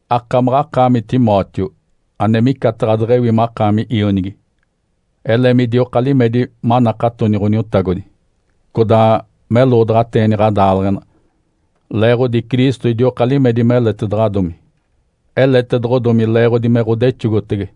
Akamaɡ̶akaami Timóteo, ane micataɡ̶a deɡ̶ewi makaami ionigi, ele midioka limedi manakatoni Ǥoniotagodi, codaa meloodaɡ̶ateeni ɡ̶adaaleɡ̶ena, leeɡ̶odi Cristo idioka limedi meletedaɡ̶adomi. Eletedoɡ̶odomi leeɡ̶odi me ɡ̶odexogotege.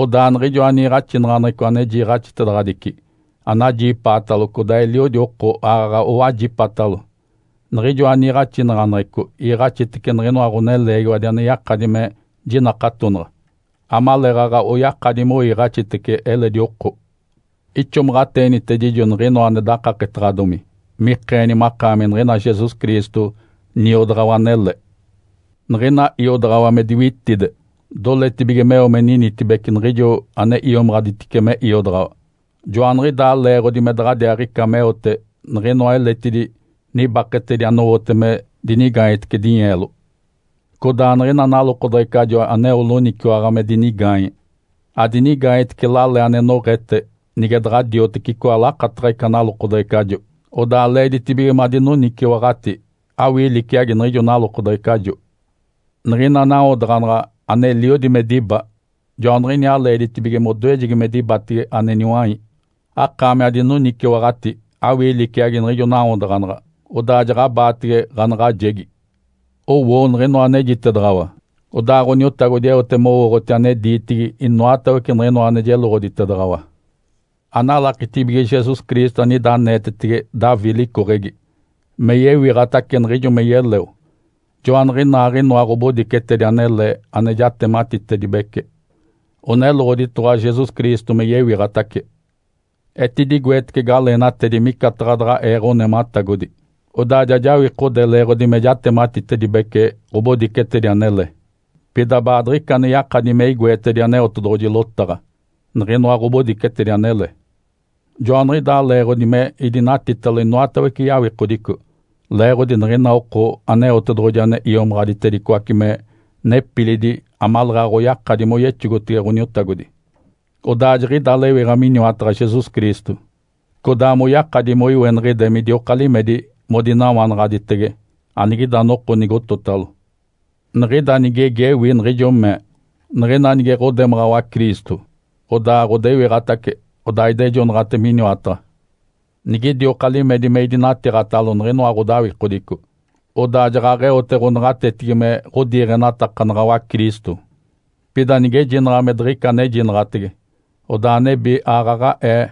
Odaa niɡ̶ijoa niiɡ̶axinaɡ̶aneɡ̶eco ane jiiɡ̶axitedaɡ̶adici, anajipaatalo codaa eliodi oko aaɡ̶aɡ̶a owajipatalo, niɡ̶ijoa niiɡ̶axinaɡ̶aneɡ̶eco iiɡ̶axinitece niɡ̶inoa ɡ̶oneleegiwadi ane yakadi me jinakatonaɡ̶a, amaleeɡ̶aɡ̶a oyakadi moiiɡ̶axitece eledi oko. Ixomaɡ̶ateenitedijo niɡ̶inoa ane dakaketaɡ̶adomi mikeeni makaami niɡ̶ina Jesus Cristo niodaɡ̶awa anele. Niɡ̶ina iodaɡ̶awa me diwitide, doletibige meo me ninitibece niɡ̶ijo ane iomaɡ̶aditice me iodaɡ̶awa. Joaniɡ̶idaa leeɡ̶odi me daɡ̶adiaaɡ̶ica meote niɡ̶inoa eletidi nibaketedi anowote me dinigaanyetece dinyeelo. Codaa niɡ̶ina nalokodeɡ̶ecajo aneo loniciwaɡ̶a me dinigaanye, adinigaanyetece lale ane noɡ̶ete, nige daɡ̶a dioteci icoa ane lakataɡ̶a ica nalokodeɡ̶ecajo. (Odaa leeditibige madinoniciwaɡ̶ati awii liciagi niɡ̶ijo nalokodeɡ̶ecajo). Niɡ̶ina nawodaɡ̶anaɡ̶a aneliodi me diba, joaniɡ̶iniaa leeditibige modoejegi me dibatege ane niwai. (Akaami adinoniciwaɡ̶ati awii liciagi niɡ̶ijo nawodaɡ̶anaɡ̶a, odaa jaɡ̶abaatege ɡ̶anaɡ̶ajegi.) Owoo niɡ̶inoa anejitedaɡ̶awa, odaa Ǥoniotagodi eote mowooɡ̶oti ane diitigi inoatawece niɡ̶inoa ane jeloɡ̶oditedaɡ̶awa. Analakitibige Jesus Cristo, anida aneetetege Davi licoɡ̶egi, me yewiɡ̶atace, niɡ̶ijo me yeleo. Joaniɡ̶inaaɡ̶inoa ɡ̶obodicetedi anele ane jatematitedibece, oneloɡ̶oditoɡ̶owa Jesus Cristo me yewiɡ̶atace. Etidigoetece galeenatedi micataɡ̶a daɡ̶a ee ɡ̶onematagodi, odaa ja jawikode leeɡ̶odi me jatematitedibece ɡ̶obodicetedi anele. Pida baadiɡ̶ica ane yakadi me igoetedi Aneotedoɡ̶oji lotaɡ̶a, niɡ̶inoa ɡ̶obodicetedi anele. Joaniɡ̶idaa leeɡ̶odi me idinatitalo inoatawece yawikodico leeɡ̶odi niɡ̶ina oko Aneotedoɡ̶oji ane iomaɡ̶aditedicoace me nepilidi amaleeɡ̶aɡ̶a oyakadi moyexogotege Ǥoniotagodi, odaa jiɡ̶ida lewiɡ̶a miniwataɡ̶a Jesus Cristo, codaa moyakadi moiweniɡ̶ide midioka limedi modinawanaɡ̶aditege, anigida noko nigototalo. Niɡ̶ida nigegi ewi niɡ̶ijo mee, “Niɡ̶ina nige ɡ̶odemaɡ̶awa Cristo, odaa ɡ̶odewiɡ̶atace odaa idejonaɡ̶ate miniwataɡ̶a. Nigidioka limedi me idinatiiɡ̶atalo niɡ̶inoa ɡ̶odawikodico, odaa jaɡ̶aɡ̶eote ɡ̶onaɡ̶atetigi me ɡ̶odiiɡ̶enatakanaɡ̶awa Cristo. Pida nigejinaɡ̶a me diɡ̶ica anejinaɡ̶atege, odaa nebi aaɡ̶aɡ̶aee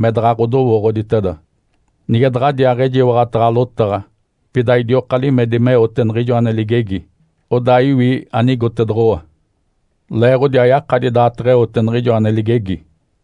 me daɡ̶a ɡ̶odowooɡ̶oditeda. Nige daɡ̶adiaaɡ̶ejiwaɡ̶ataɡ̶a lotaɡ̶a, pida idioka limedi meote niɡ̶ijo ane ligegi (odaa iwi anigotedoɡ̶owa)”. (Leeɡ̶odi ayakadi daateɡ̶eote niɡ̶ijo ane ligegi.)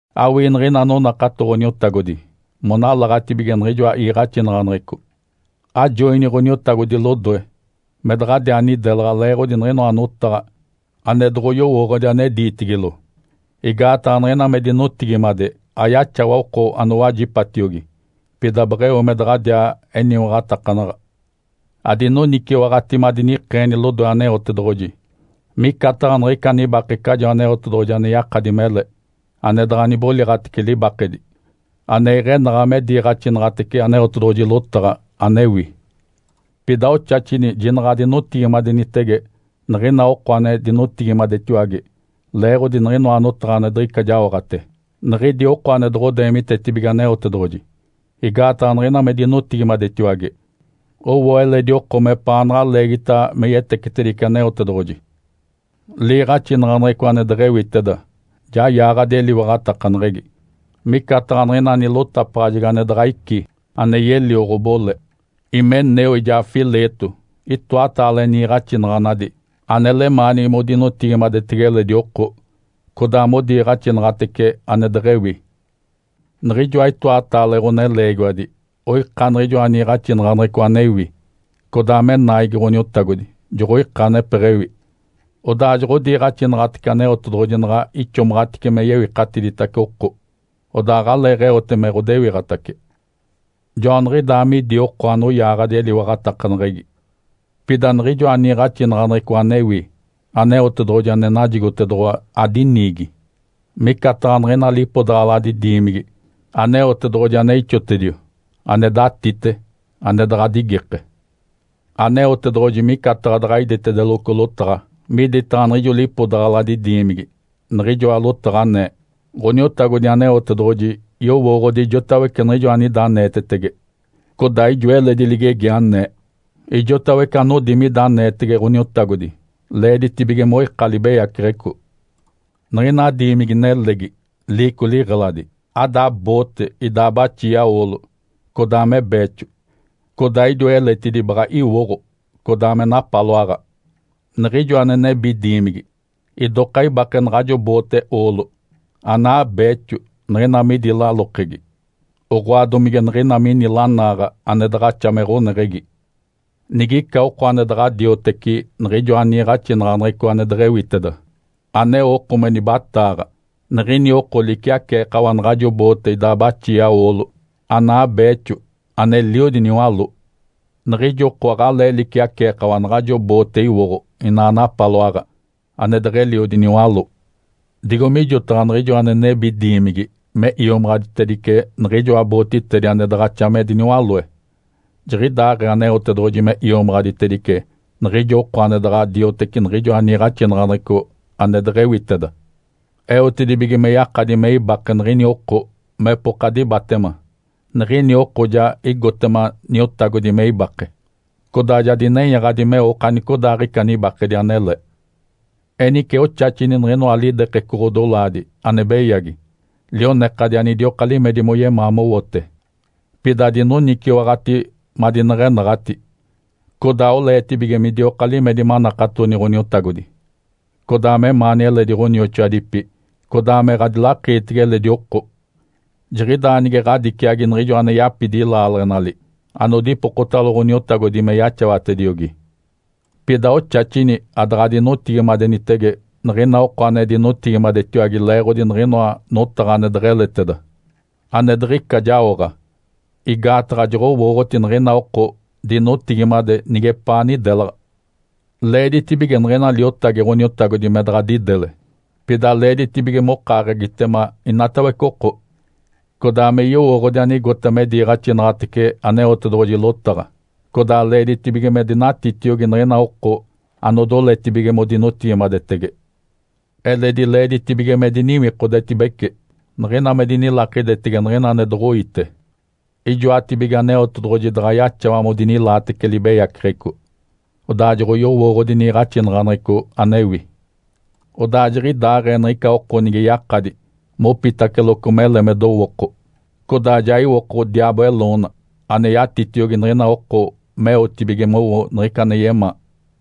Awii niɡ̶ina anonakato Ǥoniotagodi monalaɡ̶atibige niɡ̶ijoa iiɡ̶axinaɡ̶aneɡ̶eco. Ajoini Ǥoniotagodi lodoe me daɡ̶adiaa nidelaɡ̶a leeɡ̶odi niɡ̶inoa notaɡ̶a ane doɡ̶oyowooɡ̶odi ane diitigilo, igaataɡ̶a niɡ̶ina me dinotigimade ayaxawa oko anowajipatiogi, pida beɡ̶eo me daɡ̶adiaa eniwaɡ̶atakanaɡ̶a. Adinoniciwaɡ̶ati madinikeeni lodoe Aneotedoɡ̶oji micataɡ̶a niɡ̶ica nibakecajo Aneotedoɡ̶oji ane yakadi mele, ane daɡ̶a niboliɡ̶atece libakedi, ane iɡ̶enaɡ̶a me diiɡ̶axinaɡ̶atece Aneotedoɡ̶oji lotaɡ̶a anewi. Pida oxaxini jinaɡ̶a adinotigimadenitege niɡ̶ina oko ane dinotigimadetiwage leeɡ̶odi niɡ̶inoa notaɡ̶a ane diɡ̶ica jaoɡ̶ate, niɡ̶idi oko ane doɡ̶odeemitetibige Aneotedoɡ̶oji. Igaataɡ̶a niɡ̶ina me dinotigimadetiwage, owo eledi oko mepaanaɡ̶a leegita me yetecetedice Aneotedoɡ̶oji. Liiɡ̶axinaɡ̶aneɡ̶eco ane deɡ̶ewiteda ja yaaɡ̶adi eliwaɡ̶atakaneɡ̶egi, micataɡ̶a niɡ̶ina nilotapaɡ̶ajegi ane daɡ̶a ici ane yelio ɡ̶obole. Himeneu, ijaa Fileto itoataale niiɡ̶axinaɡ̶anadi ane lemaanigi modinotigimadetege eledi oko, codaa modiiɡ̶axinaɡ̶atece ane deɡ̶ewi. Niɡ̶ijoa itoataale ɡ̶oneleegiwadi oika niɡ̶ijoa niiɡ̶axinaɡ̶aneɡ̶eco anewi, codaa me naigi Ǥoniotagodi joɡ̶oika anepeɡ̶ewi, odaa joɡ̶odiiɡ̶axinaɡ̶atece Aneotedoɡ̶oji naɡ̶a ixomaɡ̶atice me yewikatiditace oko, odaa aɡ̶aleeɡ̶eote me ɡ̶odewiɡ̶atace. Joaniɡ̶idaa midi oko anoyaaɡ̶adi eliwaɡ̶atakaneɡ̶egi. Pida niɡ̶ijoa niiɡ̶axinaɡ̶aneɡ̶eco anewi Aneotedoɡ̶oji ane najigotedoɡ̶owa adiniigi. Micataɡ̶a niɡ̶ina lipodaɡ̶aladi diimigi Aneotedoɡ̶oji ane ixotedio, ane datite, ane daɡ̶a digike. Aneotedoɡ̶oji micataɡ̶a daɡ̶a iditedeloco lotaɡ̶a miditaɡ̶a niɡ̶ijo lipodaɡ̶aladi diimigi, niɡ̶ijoa lotaɡ̶a anee, “Ǥoniotagodi Aneotedoɡ̶oji yowooɡ̶odi ijotawece niɡ̶ijo anida aneetetege”, codaa ijo eledi ligegi anee, “Ijotawece anodi mida aneetege Ǥoniotagodi, leeditibige moika libeyaceɡ̶eco.” Niɡ̶ina diimigi-nelegi, liico liɡ̶eladi, ada boote idaa baxia oolo, codaa me beexo. Codaa idiwa eletidi baɡ̶a iwoɡ̶o, codaa me napaloaɡ̶a. Niɡ̶ijo ane nebi diimigi idoka ibake naɡ̶ajo boote oolo, anaa beexo niɡ̶ina midi lalokegi, oɡ̶oa, domige niɡ̶ina mini lanaaɡ̶a ane daɡ̶axa me ɡ̶oneɡ̶egi. Nigica oko ane daɡ̶a dioteci niɡ̶ijoa niiɡ̶axinaɡ̶aneɡ̶eco ane deɡ̶ewiteda, aneo oko me nibataaɡ̶a, niɡ̶ini oko liciaceekawa naɡ̶ajo boote idaa baxia oolo, anaa beexo, aneliodi niwaló. Niɡ̶ijo oko aɡ̶alee liciaceekawa naɡ̶ajo boote iwoɡ̶o inaa napaloaɡ̶a ane deɡ̶eliodi niwaló. Digo mijotaɡ̶a niɡ̶ijo ane nebi diimigi me iomaɡ̶aditedice niɡ̶ijoa bootitedi ane daɡ̶axa me diniwaloe, jiɡ̶idaaɡ̶ee Aneotedoɡ̶oji me iomaɡ̶aditedice niɡ̶ijo oko ane daɡ̶a dioteci niɡ̶ijoa niiɡ̶axinaɡ̶aneɡ̶eco ane deɡ̶ewiteda, eotedibige me yakadi me ibake niɡ̶ini oko mepoka dibatema. Niɡ̶ini oko ja igotema Niotagodi me ibake, codaa ja dinenyaɡ̶adi meo okanicodaaɡ̶ica nibakedi anele. Enice oxaxini niɡ̶inoa lidekeco ɡ̶odolaadi ane beyagi lionekadi anidioka limedi moyemaa mowote. Pida adinoniciwaɡ̶ati madineɡ̶enaɡ̶ati, codaa oleetibige midioka limedi manakatoni Ǥoniotagodi, codaa memaani eledi ɡ̶onioxoadipi, codaa me ɡ̶adilakiitege eledi oko. Jiɡ̶idaa nige ɡ̶adiciagi niɡ̶ijo ane yapidi laaleɡ̶enali anodipokotalo Ǥoniotagodi me yaxawatediogi. Pida oxaxini adaɡ̶adinotigimadenitege niɡ̶ina oko ane dinotigimadetiwage leeɡ̶odi niɡ̶inoa notaɡ̶a ane deɡ̶eleteda, ane diɡ̶ica jaoɡ̶a, igaataɡ̶a joɡ̶owooɡ̶oti niɡ̶ina oko dinotigimade nigepaa nidelaɡ̶a. Leeditibige niɡ̶ina liotagi Ǥoniotagodi me daɡ̶a didele. Pida leeditibige mokaaɡ̶egitema inatawece oko, codaa me yowooɡ̶odi anigota me diiɡ̶axinaɡ̶atece Aneotedoɡ̶oji lotaɡ̶a, codaa leeditibige me dinatitiogi niɡ̶ina oko anodoletibige modinotigimadetege. Eledi leeditibige me diniwikodetibece niɡ̶ina me dinilakidetege niɡ̶ina ane doɡ̶oiite. Ijoatibige Aneotedoɡ̶oji daɡ̶a yaxawa modinilaatece libeyaceɡ̶eco, odaa joɡ̶oyowooɡ̶odi niiɡ̶axinaɡ̶aneɡ̶eco anewi. Odaa jiɡ̶idaaɡ̶ee niɡ̶ica oko nige yakadi mopitaceloco mele me dowooko, codaa ja iwoko diaabo eloona, ane yatitiogi niɡ̶ina oko meotibige mowo niɡ̶ica ane yemaa.